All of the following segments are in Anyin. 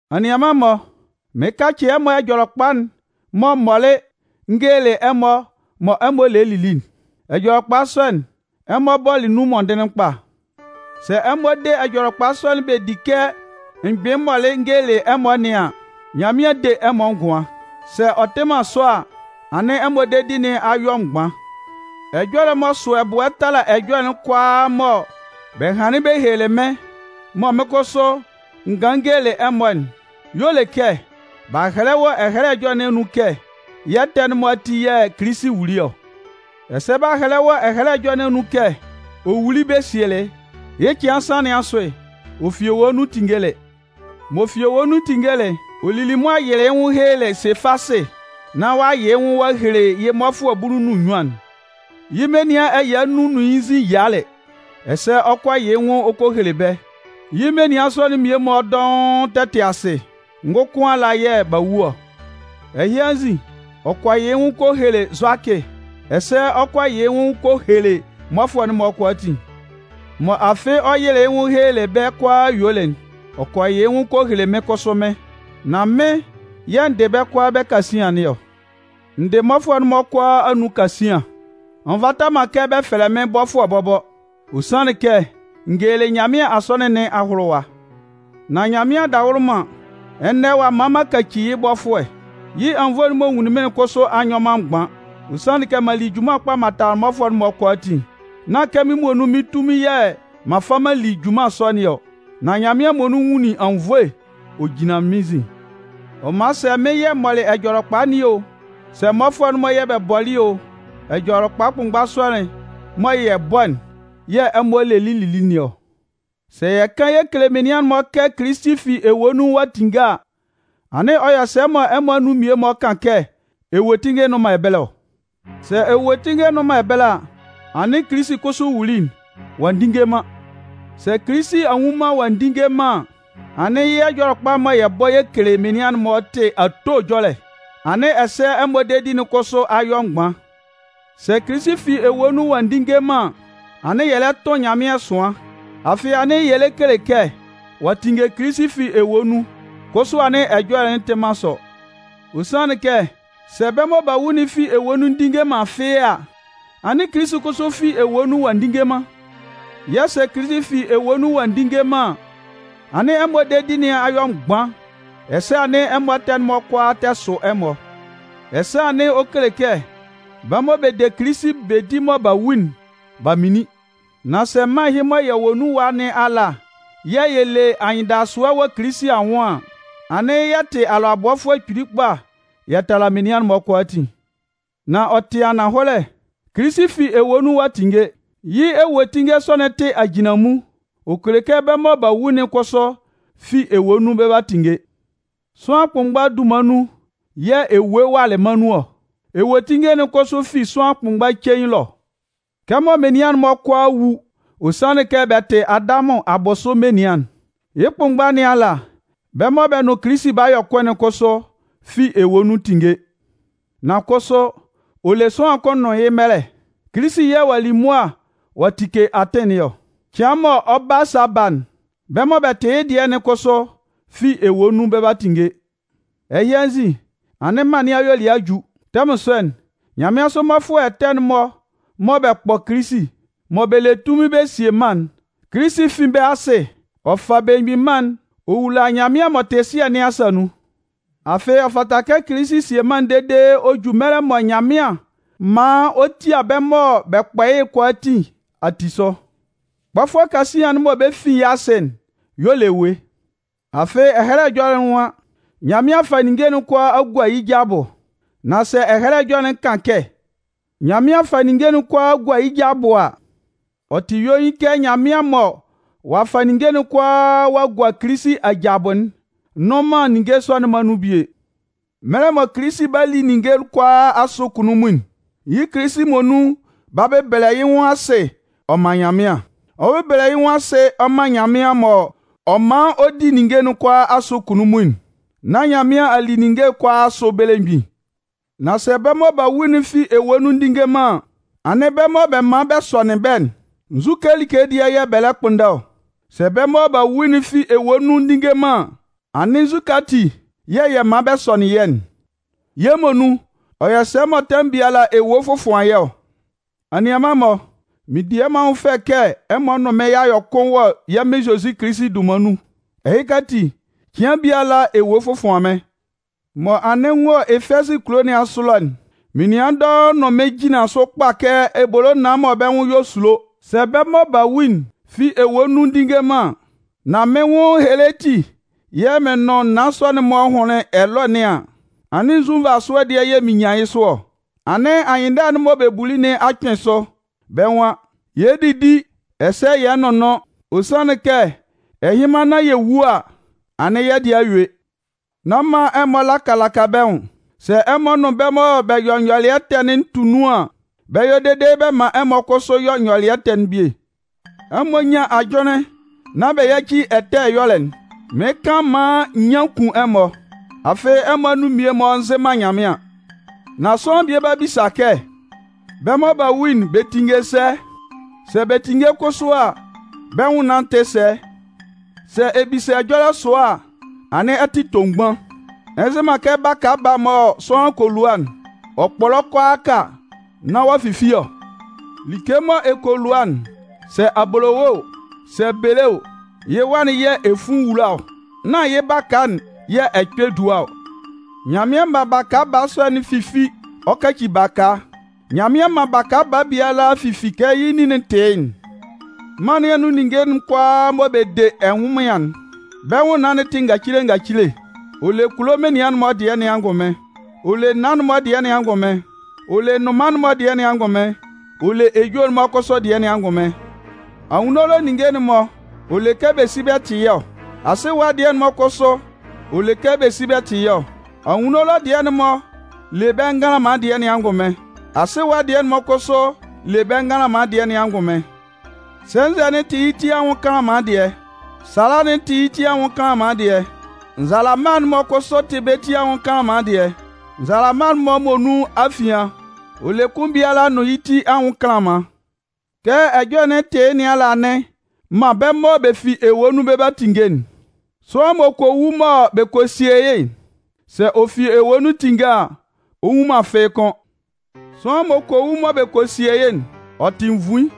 Anianman-mɔ, mɩɩn kacɩ ɛmɔ Ɛjɔlɛkpa'n mɔ m mɔlɩ n gelelɩ ɛmɔ mɔ ɛmɔ lelɩ lili'n. Ɛjɔlɛkpa sɔ'n, ɛmɔ bɔlɩ nun mɔndɩnlɩn kpa. Sɛ ɛmɔ de Ɛjɔlɛkpa sɔ'n bɛ di kɛ m gbɩnlɩn m mɔlɩ n gelelɩ ɛmɔ nɩn an, Nyanmɩan 'de ɛmɔ ngʋan. Sɛ ɔ tɩ man sɔ a, anɩn ɛmɔ dedi nɩn a yɔ mgban. Ɛjɔlɛ m'ɔ sʋ ɛbʋɛ tala ɛjɔlɛ'n kʋalaa mɔ bɛ hanlɩn bɛ helelɩ mɩ́n mɔ mɩ́n kʋsʋ n ganlɩn n gelelɩ ɛmɔ'n y'ɔ le kɛ b'a hɛlɛ wɔ Ɛhɛlɛ Ɛjɔlɛ nɩn anun kɛ yɛ́ ɛtɛ'n-mɔ ati yɛ̂ Kilisi wuli ɔ. Ɛsɛ b'a hɛlɛ wɔ Ɛhɛlɛ Ɛjɔlɛ nɩn anun kɛ ɔ wuli bɛ sielɩ. Yɩ́ cɩan nsan nɩn asʋ, ɔ fi ewue nun tinngelɩ. M'ɔ fi ewue nun tinngelɩ'n, ɔ lili mʋa yɩlɩ yɩ́ nwʋn helelɩ Sefasɩ nán ɔ'a yɩ yɩ́ nwʋn ɔ'a hele yɩ́ mmɔfʋɛ bulu nʋn nnyuan'n. Yɩ́ menian ɛya nnun nʋn yɩ́ nzin yialɩ ɛsɛ ɔ kɔ yɩ yɩ́ nwʋn ɔ kɔ hele bɛ́. Yɩ́ menian sɔ'n-mɔ mmie-mɔ dɔʋn tɛ tɩ asɩ, ngʋkʋn ala yɛ̂ b'a wu ɔ. Ɛhɩ anzin, ɔ kɔ yɩ yɩ́ nwʋn kɔ hele Zʋakɩ, ɛsɛ ɔ kɔ yɩ yɩ́ nwʋn ɔ kɔ kele mmɔfʋɛ'n-mɔ kʋalaatin. Mɔ afɩ ɔ yɩlɩ yɩ́ nwʋn helelɩ bɛ́ kʋalaa yuelɩ'n, ɔ kɔ yɩ yɩ́ nwʋn ɔ kɔ hele mɩ́n kʋsʋ mɩ́n. Nan mɩ́n yɛ̂ n dɩ bɛ́ kʋala bɛ́ kasian nɩn ɔ. N dɩ mmɔfʋɛ'n-mɔ kʋalaa anun kasian. Ɔ nvata man kɛ bɛ fɛlɛ mɩ́n bɔfʋɛ bɔbɔ. Ɔ sanlɩn kɛ n gelelɩ Nyanmɩan Asɔnɩn nɩn ahʋlʋwa. Nan Nyanmɩan adawʋlʋman, ɛnɛ ɔ'a man m'an kaci yɩ́ bɔfʋɛ. Yɩ́ anwunnvoe'n m'ɔ nwunlin mɩ́n'n kʋsʋ a nyɔ man mgban. Ɔ sanlɩn kɛ m'an li junman kpa m'an tala mmɔfʋɛ'n-mɔ kʋalaatin. Nán kɛ mɩ́n muonun mɩ́n tunmin yɛ̂ m'an fa m'an li junman sɔ nɩn ɔ, nan Nyanmɩan muonun nwunlin anwunnvoe ɔ jinlanlɩn mɩ́n nzin. Ɔ man sɛ mɩ́n yɛ̂ m mɔlɩ Ɛjɔlɛkpa nɩn o, sɛ mmɔfʋɛ'n-mɔ yɛ̂ bɛ bɔlɩ o, Ɛjɔlɛkpa kʋnmgba sɔ'n mɔ yɛ bɔ'n yɛ̂ ɛmɔ lelɩ lili nɩn ɔ. Sɛ yɛ kan yɛ kele menian'n-mɔ kɛ Kilisi fi ewue nun ɔ'a tinnge a, anɩn ɔ yɔ sɛ mɔ ɛmɔ anun mmie-mɔ kan kɛ ewue tinnge nnʋn man ɛbɛlɛ ɔ? Sɛ ewuetinnge nnʋn man ɛbɛlɛ a, anɩn Kilisi kʋsʋ wuli'n, ɔ'a ndinnge man. Sɛ Kilisi a nwu man ɔ'a ndinnge man an, anɩn yɩ́ Ɛjɔlɛkpa'n mɔ yɛ bɔ yɛ kele menian'n-mɔ tɩ ato ɛjɔlɛ, anɩn ɛsɛ ɛmɔ dedi'n kʋsʋ a yɔ mgban. Sɛ Kilisi fi ewue nun ɔ'a ndinnge man an, anɩn yɛ lɛ tʋn Nyanmɩan ɛsʋan. Afɩ anɩn yɛ lɛ kele kɛ ɔ'a tinnge Kilisi fi ewue nun, kʋsʋ anɩn ɛjɔlɛ'n tɩ man sɔ. Ɔ sanlɩn kɛ sɛ bɛ́ mɔ b'a wu'n fi ewue nun ndinnge man fɩ́ɩ́ a, anɩn Kilisi kʋsʋ fi ewue nun ɔ'a ndinnge man. Yɛ̂ sɛ Kilisi fi ewue nun ɔ'a ndinnge man an, anɩn ɛmɔ dedi nɩn a yɔ mgban, ɛsɛ anɩn ɛmɔ ɛtɛ'n-mɔ kʋalaa tɛ sʋ ɛmɔ. Ɛsɛ anɩn ɔ kele kɛ bɛ́ mɔ bɛ de Kilisi bɛ di mɔ b'a wu'n, b'a minlin. Nan sɛ mân ɛhɩ mɔ yɛ wɔ nun ɛwa nɩn ala yɛ̂ yɛ le anyɩndasʋɛ wɔ Kilisi anwʋn an, anɩn yɛ tɩ alʋabɔfʋɛ kpili kpa yɛ tala menian'n-mɔ kʋalaatin. Nan ɔ tɩ ananhɔlɛ, Kilisi fi ewue nun ɔ'a tinnge. Yɩ́ ewuetinnge sɔ'n tɩ ajinlanmun, ɔ kele kɛ bɛ́ mɔ b'a wu'n kʋsʋ fi ewue nun bɛ 'ba tinnge. Sʋanlan kʋnmgba dunman nun yɛ̂ ewue walɩ mân nɩn anun ɔ. Ewuetinnge'n kʋsʋ fi sʋanlan kʋnmgba cein ɛlɔ. Kɛmɔ menian'n-mɔ kʋalaa 'wu, ɔ sanlɩn kɛ bɛ tɩ Adamʋn abʋsʋ menian'n, yɩ́ kʋnmgba nɩn ala, bɛ́ mɔ bɛ nʋn Kilisi b'a yɔ kʋn'n kʋsʋ fi ewue nun 'tinnge. Nan kʋsʋ ɔ le sʋanlan kʋn nʋn yɩ́ mɛlɛ. Kilisi yɛ̂ ɔ'a li mʋa ɔ'a tike atɩn nɩn ɔ. Cɩan mɔ ɔ 'ba sa ba'n, bɛ́ mɔ bɛ tɩ yɩ́ dɩɛ'n kʋsʋ fi ewue nun 'ba tinnge. Ɛhɩ anzin, anɩn mân nɩn ayuelɩɛ a ju. Tɛmʋn sɔ'n, nyanmɩansʋ mmɔfʋɛ ɛtɛ'n-mɔ mɔ bɛ kpɔ Kilisi, mɔ bɛ le tunmin bɛ sie mân'n, Kilisi 'fin bɛ́ asɩ ɔ fa belemgbin mân'n ɔ wula Nyanmɩan m'ɔ tɩ Sɩɛ nɩn asa nun. Afɩ, ɔ fata kɛ Kilisi sie mân'n dede ɔ ju mɛlɛ mɔ Nyanmɩan maan ɔ tia bɛ́ mɔ bɛ kpɔ yɩ́'n kʋalaatin ati sʋ. Kpɔfʋɛ kasian'n mɔ bɛ 'fin yɩ́ asɩ'n y'ɔ le ewue. Afɩ Ɛhɛlɛ Ɛjɔlɛ'n nwan: Nyanmɩan a fa ninnge kʋalaa a gua yɩ́ ja abʋ. Nan sɛ Ɛhɛlɛ Ɛjɔlɛ'n kan kɛ: “Nyanmɩan a fa ninnge kʋalaa a gua yɩ́ ja abʋ” a, ɔ tɩ yuein kɛ Nyanmɩan mɔ ɔ'a fa ninnge kʋalaa ɔ'a gua Kilisi aja abʋ'n nnʋn man ninnge sɔ'n-mɔ anun bie. Mɛlɛ mɔ Kilisi 'ba li ninnge kʋalaa asʋ kunnunmun'n, yɩ́ Kilisi muonun 'ba bɛbɛlɛ yɩ́ nwʋn asɩ ɔ man Nyanmɩan. Ɔ 'bɛlɛlɛ yɩ́ nwʋn asɩ ɔ man Nyanmɩan mɔ ɔ 'man ɔ di ninnge kʋalaa asʋ kunnunmun'n, nán Nyanmɩan a li ninnge kʋalaa asʋ belemgbin. Nan sɛ bɛ́ mɔ b'a wu'n fi ewue nun ndinnge man an, anɩn bɛ́ mɔ bɛ man bɛ́ sɔnɩn bɛ́'n, nzu like dɩɛ yɛ̂ bɛ lɛ kpʋnndɛ ɔ? Sɛ bɛ́ mɔ b'a wu'n fi ewue nun ndinnge man an, anɩn nzukɛ ati yɛ̂ yɛ man bɛ sɔnɩn yɛ́'n? Yɛ́ muonun, ɔ yɔ sɛ mɔ tɛmʋn biala ewue fɔfʋan yɛ́ ɔ? Anianman-mɔ, mɩn di ɛmɔ anwʋn fɛ kɛ ɛmɔ nʋn mɩ́n y'a yɔ kʋn wɔ yɛ́ Mɩn Zozi Kilisi dunman nun. Ɛhɩka ati, cɩan biala ewue fɔfʋan mɩ́n. Mɔ anɩn n wɔ Efɛzɩ kulo nɩn asʋ ɛlɔ'n, menian dɔʋn nʋn mɩn jinlanlɩn sʋ kpa kɛ ebolo naan mɔ bɛ́ nwʋn yɔ esulo. Sɛ bɛ́ mɔ b'a wu'n fi ewue nun ndinnge man, nan mɩ́n nwʋn ehele ati yɛ̂ mɩn nʋn naan sɔ'n-mɔ hʋnlɩn ɛlɔɛ nɩn an, anɩn nzu nvasʋɛ dɩɛ yɛ̂ mɩn nyan yɩ́ sʋ ɔ? Anɩn anyɩnndala'n mɔ bɛ buli nɩn a kpɩn sʋ. Bɛ́ nwan: Yɛ dídi ɛsɛ yɛ nʋ́nnʋn, ɔ sanlɩn kɛ ɛhɩnman nán yɛ wu a, anɩn yɛ́ dɩɛ a yue. Nán man ɛmɔ laka laka bɛ́ nwʋn. Sɛ ɛmɔ nʋn bɛ́ mɔ bɛ yɔ nyɔlɩɛ ɛtɛ'n tu nun an, bɛ 'yɔ dede bɛ man ɛmɔ kʋsʋ yɔ nyɔlɩɛ ɛtɛ'n bie. Ɛmɔ nyán ajʋnlɩn nán bɛ yáci ɛtɛ ɛyɔlɛ'n. Mɩɩn kan maan nyian kun ɛmɔ, afɩ ɛmɔ anun mmie-mɔ nzɩ man Nyanmɩan. Nan sʋanlan bie 'ba bisa kɛ: “Bɛ́ mɔ b'a wu'n, bɛ 'tinnge sɛ? Sɛ bɛ tinnge kʋsʋ a, bɛ́ nwʋnnaan'n tɩ sɛ?” Sɛ ɛ bisa ɛjɔlɛ sʋa a, anɩn ɛ tɩ tomgban. Ɛ nzɩ man kɛ baka baa mɔ sʋanlan kɔ lua'n, ɔ kpɔlɔ kʋalaaka nán ɔ'a fifi ɔ? Like mɔ ɛ kɔ lua'n, sɛ abolowe o, sɛ bele o, yɩ́ wa'n yɛ̂ ɛ fun wula ɔ, nán yɩ́ baka'n yɛ̂ ɛ kpɛ dua ɔ. Nyanmɩan man baka baa sɔ'n fifi ɔ kaci baka, Nyanmɩan man baka baa biala fifi kɛ yɩ́ nin'n tɩ yɩ́'n. Mân nɩn anun ninnge'n kʋalaa mɔ bɛ de ɛnwʋnmɩan'n, bɛ́ nwʋnnaan'n tɩ ngacile ngacile. Ɔ le kulo menian'n-mɔ dɩɛ nɩn angʋnmɩn. Ɔ le naan'n-mɔ dɩɛ nɩn angʋnmɩn. Ɔ le nnʋnman'n-mɔ dɩɛ nɩn angʋnmɩn. Ɔ le ejue'n-mɔ kʋsʋ dɩɛ nɩn angʋnmɩn. Anwunno ɛlɔ ninnge'n-mɔ ɔ le kɛ bɛ si tɩ yɩ́ ɔ. Asɩ ɛwa dɩɛ'n-mɔ kʋsʋ ɔ le kɛ bɛ si tɩ yɩ́ ɔ. Anwunno ɛlɔ dɩɛ'n-mɔ le bɛ́ nganlanman dɩɛ nɩn angʋnmɩn. Asɩ ɛwa dɩɛ'n-mɔ kʋsʋ le bɛ́ nganlanman dɩɛ nɩn angʋnmɩn. Sɛnzɛ'n tɩ yɩ́ ti anwʋn kanlanman dɩɛ, sala'n tɩ yɩ́ ti anwʋn kanlanman dɩɛ. Nzalama'n-mɔ kʋsʋ tɩ bɛ́ ti anwʋn nganlanman dɩɛ. Nzalama'n-mɔ muonun afian, ɔ le kʋn biala nʋn yɩ́ ti anwʋn kanlanman. Kɛ ɛjɔlɛ'n tɩ yɩ́ nɩn ala anɩn man bɛ́ mɔ bɛ fi ewue nun bɛ 'ba tinnge'n. Sʋanlan m'ɔ kɔ wu mɔ bɛ kɔ sie yɩ́'n, sɛ ɔ fi ewue nun tinnge a, ɔ nwu man fɩ́ɩ́ kʋ́n. Sʋanlan m'ɔ kɔ wu mɔ bɛ kɔ sie yɩ́'n, ɔ tɩ nvuin,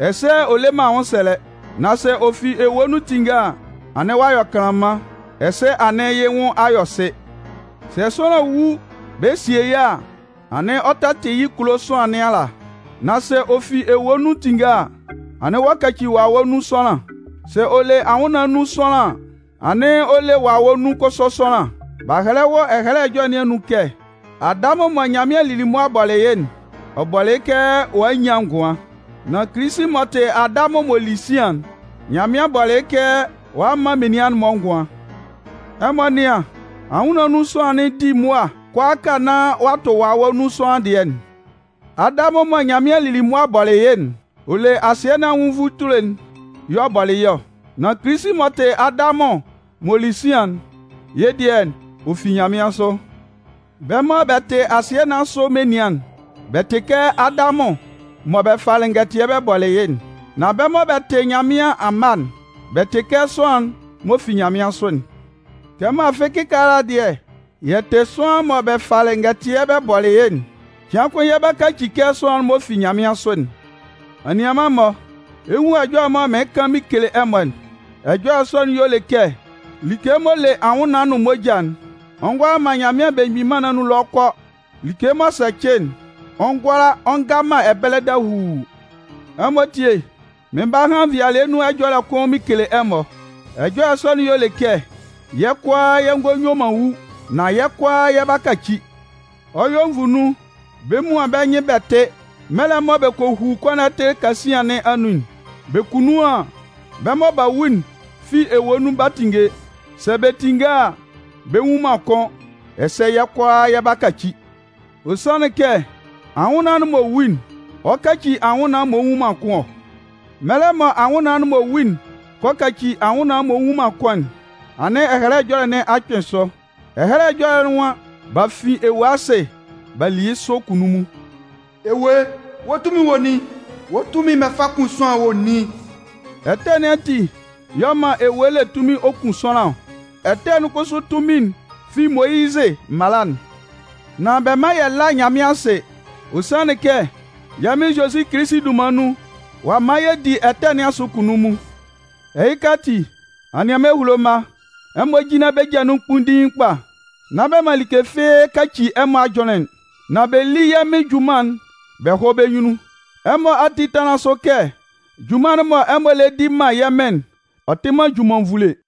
ɛsɛ ɔ le man anwʋnsɛlɛ. Nan sɛ ɔ fi ewue nun tinnge a, anɩn ɔ'a yɔ kanlanman, ɛsɛ anɩn yɩ́ nwʋn a yɔ sɩ. Sɛ sʋanlan wu bɛ sie yɩ́ a, anɩn ɔ tɛ tɩ yɩ́ kulo sʋanlan nɩn ala. Nan sɛ ɔ fi ewue nun tinnge a, anɩn ɔ'a kaci wawɛ nun sʋanlan. Sɛ ɔ le anwʋnnaan nun sʋanlan an, anɩn ɔ le wawɛ nun kʋsʋ sʋanlan. B'a hɛlɛ wɔ Ɛhɛlɛ Ɛjɔlɛ nɩn anun kɛ: Adamʋn mɔ Nyanmɩan lili mʋa bɔlɩ yɩ́'n, ɔ bɔlɩ yɩ́ kɛ ɔ'a a nyan ngʋan. Nan Kilisi m'ɔ tɩ Adamʋn m'ɔ li sian'n, Nyanmɩan bɔlɩ yɩ́ kɛ ɔ'a a man menian'n-mɔ ngʋan. Ɛmɔ nɩ́an, anwʋnnaan nun sʋanlan'n di mʋa kʋalaaka nán ɔ'a tʋ wawɛ nun sʋanlan dɩɛ'n. Adamʋn mɔ Nyanmɩan lili mʋa bɔlɩ yɩ́'n, ɔ le asɩɛ nɩn anwʋn nvutule'n y'ɔ bɔlɩ yɩ́ ɔ. Nan Kilisi m'ɔ tɩ Adamʋn m'ɔ li sian'n, yɩ́ dɩɛ ɔ fi nyanmɩansʋ. Bɛ́ mɔ bɛ tɩ asɩɛ nɩn asʋ menian'n, bɛ tɩ kɛ Adamʋn mɔ bɛ falɩ ngɛtɩɛ bɛ bɔlɩ yɩ́'n. Nan bɛ́ mɔ bɛ tɩ Nyanmɩan amma'n, bɛ tɩ kɛ sʋanlan'n m'ɔ fi nyanmɩansʋ'n. Kɛmɔ afɩ kɩkaala dɩɛ yɛ tɩ kɛ sʋanlan'n mɔ bɛ falɩ ngɛtɩɛ bɛ bɔlɩ yɩ́'n, cɩan kʋn yɛ 'ba kaci kɛ sʋanlan'n m'ɔ fi nyanmɩansʋ'n. Anianman-mɔ, ɛ 'nwun ɛjɔlɛ mɔ mɩɩn kan mɩn kele ɛmɔ'n. Ɛjɔlɛ sɔ'n y'ɔ le kɛ like m'ɔ le anwʋnnaan nʋn moja'n, ɔ ngʋala man Nyanmɩan Belemgbin Mân nɩn anun ɛlɔ kɔ. Like m'ɔ sɛcɩ'n, ɔ ngʋala ɔ nga man ɛbɛlɛ dahuu. Ɛmɔ tíe, mɩɩn 'ba han nvɩalɩɛ nun ɛjɔlɛ kʋn mɩn kele ɛmɔ. Ɛjɔlɛ sɔ'n y'ɔ le kɛ yɛ́ kʋalaa yɛ ngɔ yue man wu, nan yɛ́ kʋalaa yɛ 'ba kaci. Ɔ 'yɔ nvu nun, bɛ 'muan bɛ́ nyɩn bɛ tɩ, mɛlɛ mɔ bɛ kɔ hu kɔnɔtɩ kasian nɩn anun'n. Bɛ ku nun an, bɛ́ mɔ b'a wu'n fi ewue nun 'ba tinnge. Sɛ bɛ tinnge a, bɛ nwun man kʋ́n ɛsɛ yɛ́ kʋalaa yɛ 'ba kaci. Ɔ sanlɩn kɛ anwʋnnaan'n m'ɔ wu'n, ɔ 'kaci anwʋnnaan m'ɔ nwu man kʋ́n ɔ. Mɛlɛ mɔ anwʋnnaan'n m'ɔ wu'n kɔ kaci anwʋnnaan m'ɔ nwu man kʋ́n'n, anɩn Ɛhɛlɛ Ɛjɔlɛ nɩn a kpɩn sʋ. Ɛhɛlɛ Ɛjɔlɛ'n nwan: B'a fin ewue asɩ b'a li yɩ́ sʋ kunnunmun. Ewue, wɔ́ tunmin'n wɔ nin? Wɔ́ tunmin'n mɔ ɛ fa kun sʋanlan'n wɔ nin? Ɛtɛ nɩn ati y'ɔ man ewue le tunmin ɔ kun sʋanlan ɔ. Ɛtɛ'n kʋsʋ tunmin'n fi Moyizɩ mala'n. Nan bɛ mán yɛ lá Nyanmɩan asɩ, ɔ sanlɩn kɛ yɛ́ Mɩn Zozi Kilisi dunman nun, ɔ'a man yɛ di ɛtɛ nɩn asʋ kunnunmun. Ɛhɩka ati, anianman ehulo mma, ɛmɔ jínlan bɛ́ ja nun kpunndiin kpa, nán bɛ man like fɩ́ɩ́ kaci ɛmɔ ajʋnlɩn, nan bɛ lí yɛ́ Mɩn junman'n bɛ hɔ́ bɛ́ nyunnun. Ɛmɔ ati tánlan sʋ kɛ junman'n mɔ ɛmɔ lɛ di man yɛ́ Mɩn'n, ɔ tɩ man junman nvule.